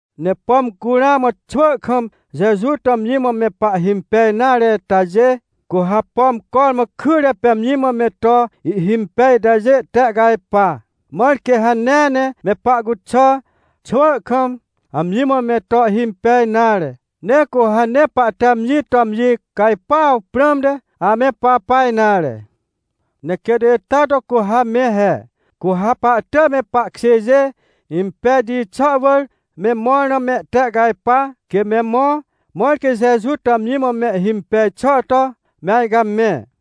Ne pom cu ramã xwỳ kam Jeju to amji mã me pahhimpej nare itajê, cu ha, pom cormã kyre pê amji mã me to ihhimpej itajê tehcajpa, mãr quê hanea ne me pahcuxà, xwỳ kam amji mã me to ihhimpej nare. Ne cu ha nee pahte amji to amji cajpuaw prãmte ame papa nare. Ne quêt ita to cu ha me he. Cu ha pahtỳj me pahkjêjê impejti xà wỳr me mõr na mehtehcajpa, quê me mõ, mãr quê Jeju to amji mã mehhimpej xà to me ajcamẽ.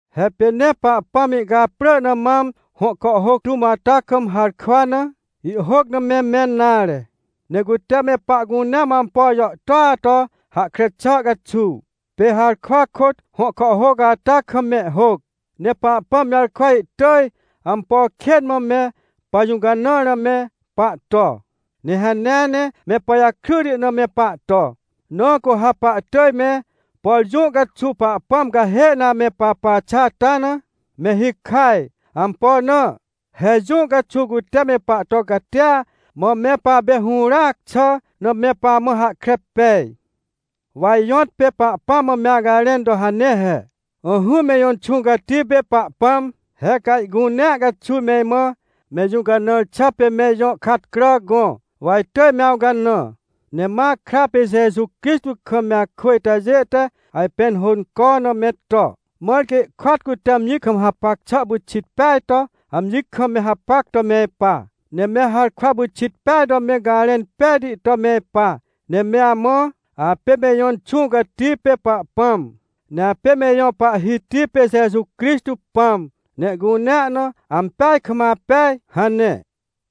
He pê nee Pahpãm ihcaprỳ na mam hõ kàhhôc tũm ata kam harkwa na, ihhôc na me mẽn nare. Ne cute me pahcunea mã ampo jàhtôa to hahkre xà caxuw, pê harkwa kôt hõ kàhhôc ata kam mehhôc. Ne Pahpãm jarkwa ihtỳj ampo kên mã me pajũcanãr na me pahto, ne hanea ne me pajakryti na me pahto. Na cu ha pahtỳj me, por jũ caxuw Pahpãm cahê na ame papa xà ata na, me hikaj. Ampo na? He jũ caxuw cute me pahto catia, mã me papê hũràac xà na me pamã hahkre pej. Wa ijõtpê Pahpãm mã me acajrẽn to hane he: — Ỹhỹ me ijõ Inxũ Cati pê Pahpãm, he ca ihcunea caxuw me imã me ijũcanãr xà pê me ijõ katcrà gõ, wa itỳj me awcanã. Ne ma akra pê Jeju Crixtô kam me akwỳ itajê te ajpẽn hônco na me to, mãr quê ihkôat cute amji kam hapac xà pyxit peaj to amji kam me hapac to me ipa. Ne me harkwa pyxit peaj to me garẽn pejti to me ipa, ne me amã: “Apê me ijõ Inxũ Cati pê Pahpãm, ne apê me ijõ Pahhiti pê Jeju Crixtô Pãm, ne ihcunea na ampeaj kam apej” — hane.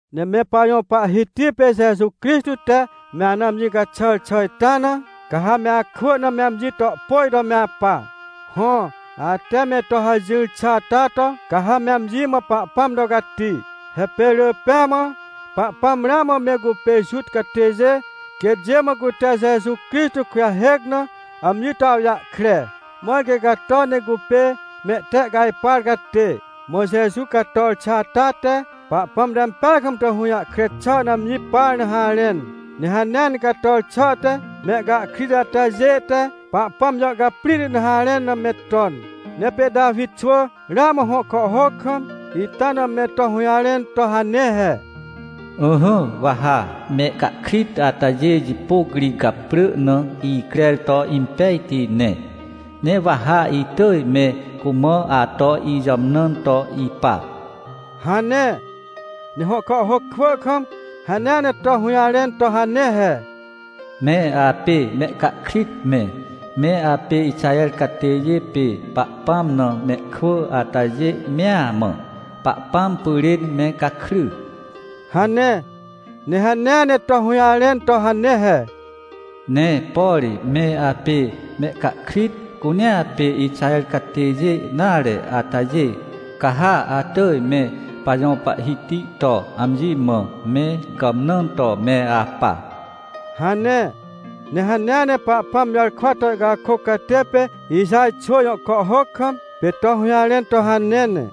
Ne me pajõ Pahhiti pê Jeju Crixtô te me ana amji caxàr xà ita na, ca ha me akwỳ na me amji to pôj to me apa. Hõ, ate me to hajỹr xà ata to, ca ha me amji mã Pahpãm to cati. He pê rỳ pêa mã Pahpãm ramã me cupê Juta catêjê quêtjê mã cute Jeju Crixtô kujahêc na amji to awjahkre, mãr quê cato ne cupê mehtehcajpar catê. Mã Jeju cator xà ata te, Pahpãm te ampeaj kam to hũjahkre xà na amji par na harẽn. Ne hanea ne cator xà te, mehcahkrit atajê te Pahpãm jàhcaprĩhti na harẽn na me ton. Ne pê Tawi xwỳ ramã hõ kàhhôc kam, ita na me to hũjarẽn to hane he: “Ỹhỹ, wa ha mehcahkrit atajê jipôc ri gaprỳ na icrer to impejti ne, ne wa ha itỳj me cumã ato ijàmnãn to ipa” hane. Ne hõ kàhhôc kwỳ kam hanea ne to hũjarẽn to hane he: “Me apê mehcahkrit me, me apê Ixaher catêjê pê Pahpãm na mehkwỳ atajê mea mã, Pahpãm pyrên me gakry!” hane. Ne hanea ne to hũjarẽn to hane he: “Ne por me apê mehcahkrit cunea pê Ixaher catêjê nare atajê, ca ha atỳj me pajõ Pahhiti to amji mã me gàmnãn to me apa” hane. Ne hanea ne Pahpãm jarkwa to ihcakôc catê pê Ixaj xwỳ jõ kàhhôc kam, pê to hũjarẽn to hanea he: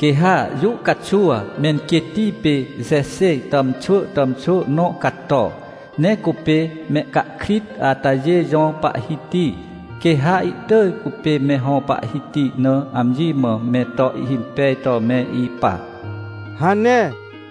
“Quê ha jũ caxuw menquêtti pê Jexê tàmxwỳ tàmxwỳ nõ cato. Ne cupê mehcahkrit atajê jõ Pahhiti. Quê ha ihtỳj cupê me hõ Pahhiti na amji mã me to ihhimpej to me ipa” hane.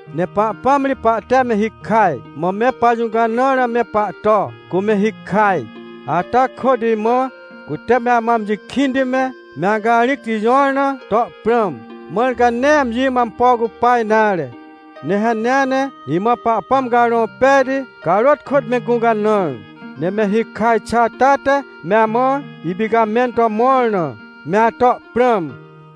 Ne Pahpãm ri pahte me hikaj, mã me pajũcanãr na me pahto, cu me hikaj. Ata kôt imã, cute me amã amji kĩnti me, me acarĩcti jõr na, to prãm, mãr ca nee amji mã ampo cupa nare. Ne hanea ne imã Pahpãm Carõ Pejti carôt kôt me gũcanãr, ne me hikaj xà ata te me amã ipicamẽn to mõr na, me ato prãm.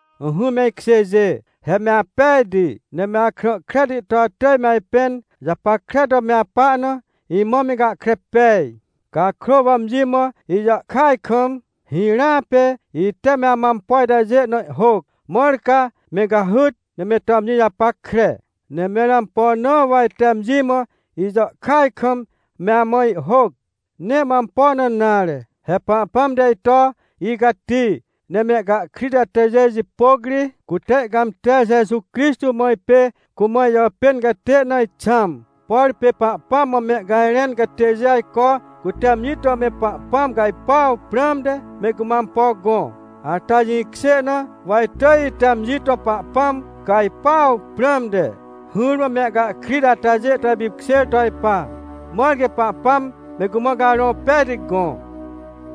Ỹhỹ me ikjêjê, he me apejti, ne me akrã kreti to atỳj me ajpẽn japackre to me apa na, imã me gahkre pej. Cakrô wa amji mã ijàhkyaj kam, hirãa pê ite me amã ampo itajê na ihhôc, mãr ca me cahyt, ne me to amji japackre. Ne mẽr ampo na wa ite amji mã ijàhkyaj kam me amã ihhôc? Nee mã ampo na nare. He Pahpãm te ito icati, ne mehcahkrit atajê jipôc ri, cute ihcãmter Jeju Crixtô mã ipê cumã ijàpên catê na ixãm. Por pê Pahpãm mã mehcajrẽn catêjê ajco cute amji to me Pahpãm cajpuaw prãmte me cumã ampo gõ, ata jĩkjê na, wa itỳj ite amji to Pahpãm cajpuaw prãmte, hỹrmã mehcahkrit atajê to ipipkjêr to ipa, mãr quê Pahpãm me cumã Carõ Pejti gõ.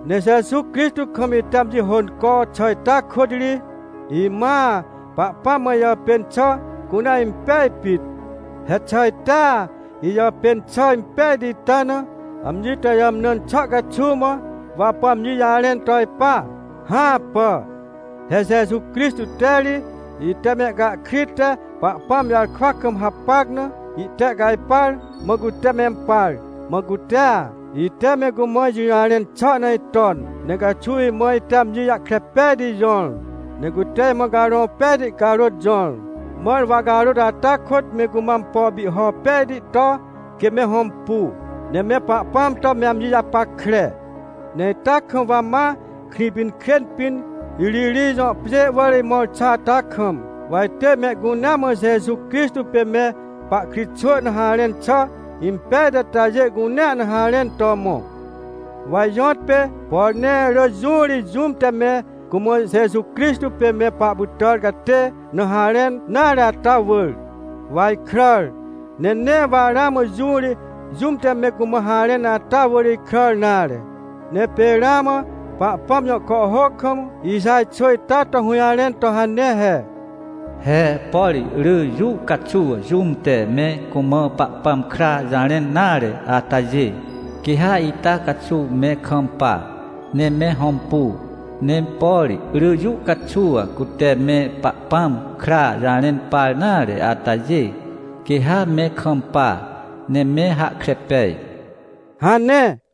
Ne Jeju Crixtô kam ite amji hônco xà ita kôt ri, imãa Pahpãm mã ijàpên xà cunea impej pit. He xà itea ijàpên xà impejti ita na, amji to ijàmnãn xà caxuw mã, wa apu amji jarẽn to ipa? Hãpà. He Jeju Crixtô te ri ite mehcahkrit te Pahpãm jarkwa kam hapac na itehcajpar, mã cute mempar. Mã cutea, ite me cumã ijũjarẽn xà na iton, ne caxuw imã ite amji jahkre pejti jõr. Ne cute imã Carõ Pejti carôt jõr, mãr wa carôt ata kôt me cumã ampo pihho pejti to, quê me hõmpu, ne me Pahpãm to me amji japackre. Ne ita kam wa ma Krĩpinkrên pĩn, Iririj jõ pjê wỳr imõr xà ata kam, wa itỳj mehcunea mã Jeju Crixtô pê me pahkritxwỳ na harẽn xà impejti atajê cunea na harẽn to mõ. Wa ijõtpê, por nee rỳ jũ ri jũm te me cumã Jeju Crixtô pê me pahpytàr catê na harẽn nare ata wỳr, wa ikràr. Ne nee wa ramã jũ ri jũm te me cumã harẽn ata wỳr ikràr nare. Ne pê ramã Pahpãm jõ kàhhôc kam Ixaj xwỳ ita to hũjarẽn to hane he: “He por rỳ jũ caxuw jũm te me cumã Pahpãm kra jarẽn nare atajê, quê ha ita caxuw me kampa, ne me hõmpu. Ne por rỳ jũ caxuw cute me Pahpãm kra jarẽn par nare atajê, quê ha me kampa, ne me hahkre pej” hane.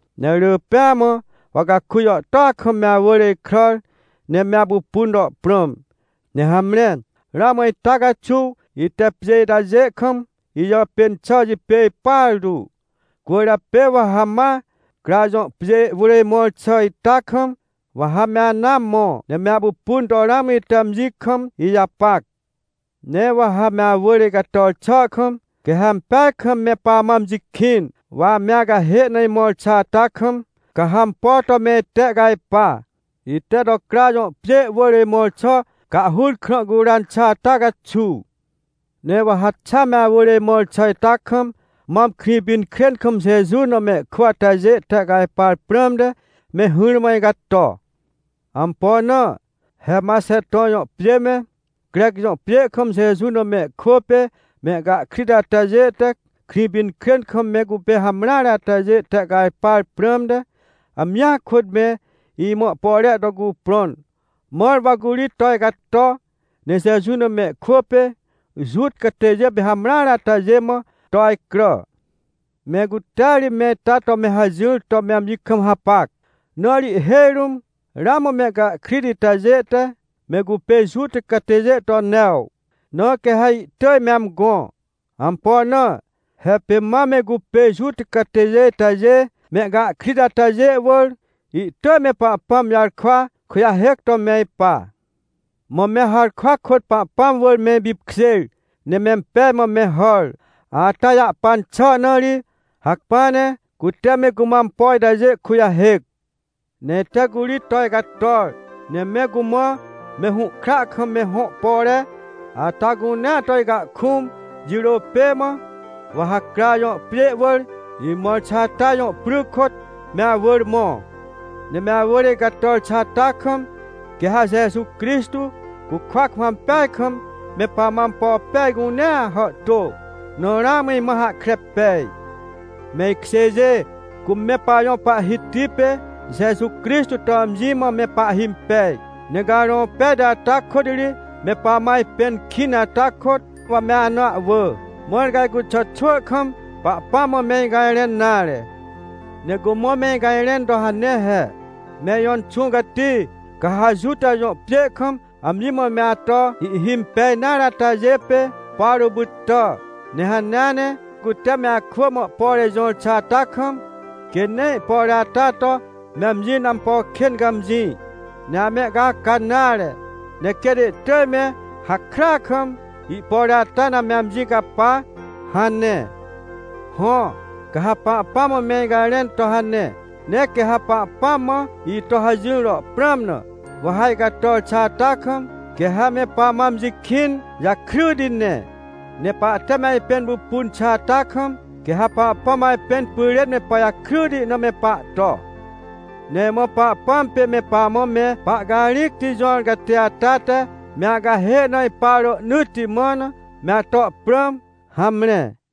Ne rỳ pêa mã, wa caku jàhtôa kam me awỳr ikràr, ne me apupun to prãm, ne hamre, ramã ita caxuw ite pjê itajê kam ijàpên xà jipêj partu. Cwỳrjapê wa ha ma Cra jõ pjê wỳr imõr xà ita kam, wa ha me anaa mõ, ne me apupun to ramã ite amji kam ijapac. Ne wa ha me awỳr icator xà kam, quê ha ampeaj kam me pamã amji kĩn. Wa ame acahê na imõr xà ata kam, ca ha ampo to me itehcajpa, ite to Cra jõ pjê wỳr imõr xà cahhur krã curan xà ata caxuw. Ne wa ha xa me awỳr imõr xà ita kam, mam Krĩpinkrên kam Jeju na mehkwỳ atajê tehcajpar prãmte, me hỹrmã icato. Ampo na? He Maxeton jõ pjê me, Crec jõ pjê kam Jeju na mehkwỳ pê mehcahkrit atajê te, Krĩpinkrên kam me cupê hamreare atajê tehcajpar prãmte, amjia kôt me imã ihpore to cuprõn, mãr wa curi to icato, ne Jeju na mehkwỳ pê Juta catêjê pê hamreare atajê mã to ajcrà. Me cutea ri me ita to me hajỹr to me amji kam hapac. Na ri ihhêj rũm ramã mehcahkrit itajê te, me cupê Juta catêjê to new, na quê ha ihtỳj me amgõ. Ampo na? He pê mam me cupê Juta catêjê itajê, mehcahkrit atajê wỳr, ihtỳj me Pahpãm jarkwa kujahêc to me ipa. Mã me harkwa kôt Pahpãm wỳr me ipipkjêr, ne mempej mã me hàr, ata jahpan xà na ri, hacpỹa ne cute me cumã ampo itajê kujahêc. Ne ite curi to icator, ne me cumã me hũhkra kam me hõ pore ata cunea to icahkũm jirô pê mã, wa ha Cra jõ pjê wỳr imõr xà ata jõ pry kôt me awỳr mõ. Ne me awỳr icator xà ata kam, quê ha Jeju Crixtô cukwa kam ampeaj kam me pamã ampo pej cunea hàhtô, na ramã imã hahkre pej. Me ikjêjê, cu me pajõ Pahhiti pê Jeju Crixtô to amji mã me pahhimpej, ne Carõ Pejti ata kôt ri me pamã ajpẽn kĩn ata kôt, wa me ana ahwỳ, mãr ca icuxà xwỳ kam Pahpãm mã me icajrẽn nare. Ne cumã me icajrẽn to hane he: — Me ijõ Inxũ Cati, ca ha Juta jõ pjê kam amji mã me ato ihhimpej nare atajê pê Pawrô pytà. Ne hanea ne cute me akwỳ mã ihpore jõr xà ata kam, quê nee ihpore ata to me amji na ampo kên cãmjĩ, ne amehcaca nare, ne quêt ihtỳj me hakrya kam, ihpore ata na me amji capa — hane. Hõ, ca ha Pahpãm mã me icajrẽn to hane, ne quê ha Pahpãm mã ito hajỹr to prãm na, wa ha icator xà ata kam, quê ha me pamã amji kĩn jakryti ne. Ne pahte me ajpẽn pupun xà ata kam, quê ha Pahpãm ajpẽn pyrên me pajakryti na me pahto. Ne imã Pahpãm pê me pamã me pahcarĩcti jõr catê ata te me acahê na ipa rohnỳtti mã na, me ato prãm. Hamre.